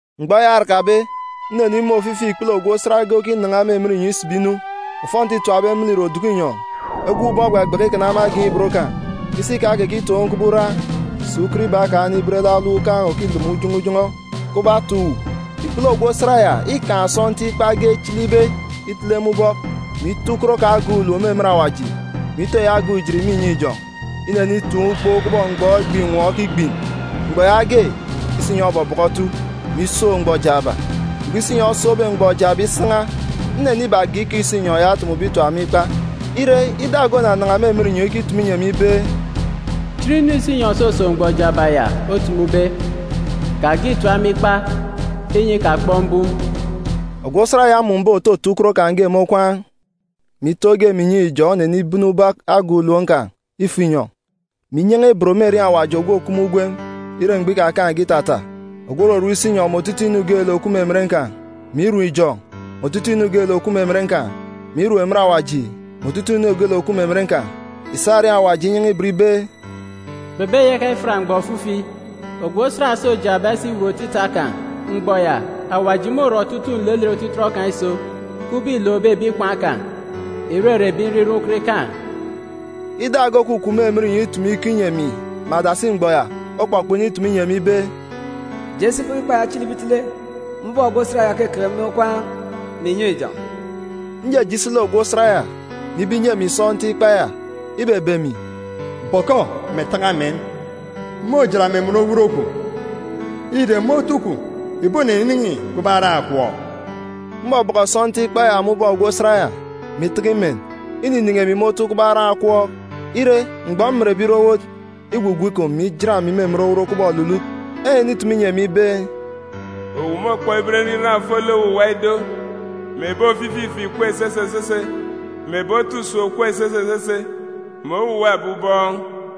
Mgbọ eya orakabe, nnenimun̄ ofifi ikpele ogwu osat ge okinan̄a me emen inyọn̄ isibi inu. Ofọnti îtapbe me lek ìre oduku inyọn̄, egop ubọọn̄ ogbagbaka ikana me agan̄ ibot kan̄, isi kan̄ okekitoon̄ kubọk ura, sà ukot iba kan̄ onibet lek alọm ukan̄ òkilomo ujọn̄ọ ujọn̄ọ kubọk atà uwu. Ikpele ogwu osat ya îkaan̄ sọntiik ikpa ge, echilibe itele, me ubọk, mè ito ukot kan̄ agan̄ ulom me emen awaji, mè ito eyi agan̄ ujit me inyọn̄ ijọn̄. Inenitaan̄ ukpo kubọk mgbọ egbe àtat okigbin. Mgbọ yaage, isinyọn̄ obọbọkọ otu, mè isook mgbọ jaaba. Mgbọ isinyọn̄ osookbe mgbọ jaaba isan̄a, nnenibage ikọ isinyọn̄ ya otumube itap me ikpa. Ire, ida ge onanan̄a me emen inyọn̄ ikitumu inyi emi ibe, “Chit inu isinyọn̄ òsosook mgbọ jaaba ya otumube. Kage ìtap me ikpa, inyi ikakpọk mbum.” Ogwu osat ya mmun̄be, òtoto ukot kan̄ ge me okwaan̄ mè ito ge me inyọn̄ ijọn̄, onenibene ubọk agan̄ ulom kan̄ ifo inyọn̄, mè inyan̄a ibot me erieen̄ Awaji ogwu òkup me ugwem ire mgbọ ikakaan̄ge itata, ogwu òrorom isinyọn̄ mè otutuuk inu geelek òkup me emen kan̄, mè irom ijọn̄, mè otutuuk inu geelek òkup me emen kan̄, mè irom emen awaji, mè otutuuk inu geelek òkup me emen kan̄. Ìsa erieen̄ Awaji inyan̄a ibot ibe, “Kpebeyaka ifiat mgbọ ofifi. Ogwu osat òso jaaba isiwut otita kan̄, mgbọ ya, Awaji môrọ otutuuk nlelet otitọt kan̄ iso, kubọk îlookbe ebi ikwaan̄ kan̄, ìrere ebi nriran ukot ikaan̄.” Ida ge òkukup me emen inyọn̄ itumu ikọ inyi emi me adasi mgbọ ya, okpọkpọk initumu inyi emi ibe, “Je si bọkọ ikpa ya echilibe itele me ubọk ogwu osat ya òkeke me okwaan̄ mè inyọn̄ ijọn̄.” Njeje isi lek ogwu osat ya, mè ibe inyi emi sọntiik ikpa ya. Ibebe emi, “Bọkọ, mè taka men. Môjat me emen owot kwun̄, ire, me otu kwun̄, ìboninin̄i kubọk aran̄ akwọọk.” Mbọbọkọ sọntiik ikpa ya me ubọk ogwu osat ya, mè itaka imen, ininin̄i emi me otu kubọk aran̄ akwọọk. Ire, mgbọ mmenbe ire owot, igwugwu ikom, mè ijat emi me emen owot kubọk olulut. Enenitumu inyi emi ibe, “Owu môkpọk iben nriran ofolek owuwa ido, mè ebi ofifi ife ìkup esese esese, mè ebi otu usem òkup esese esese, mè owuwa ebi ubọọn̄.”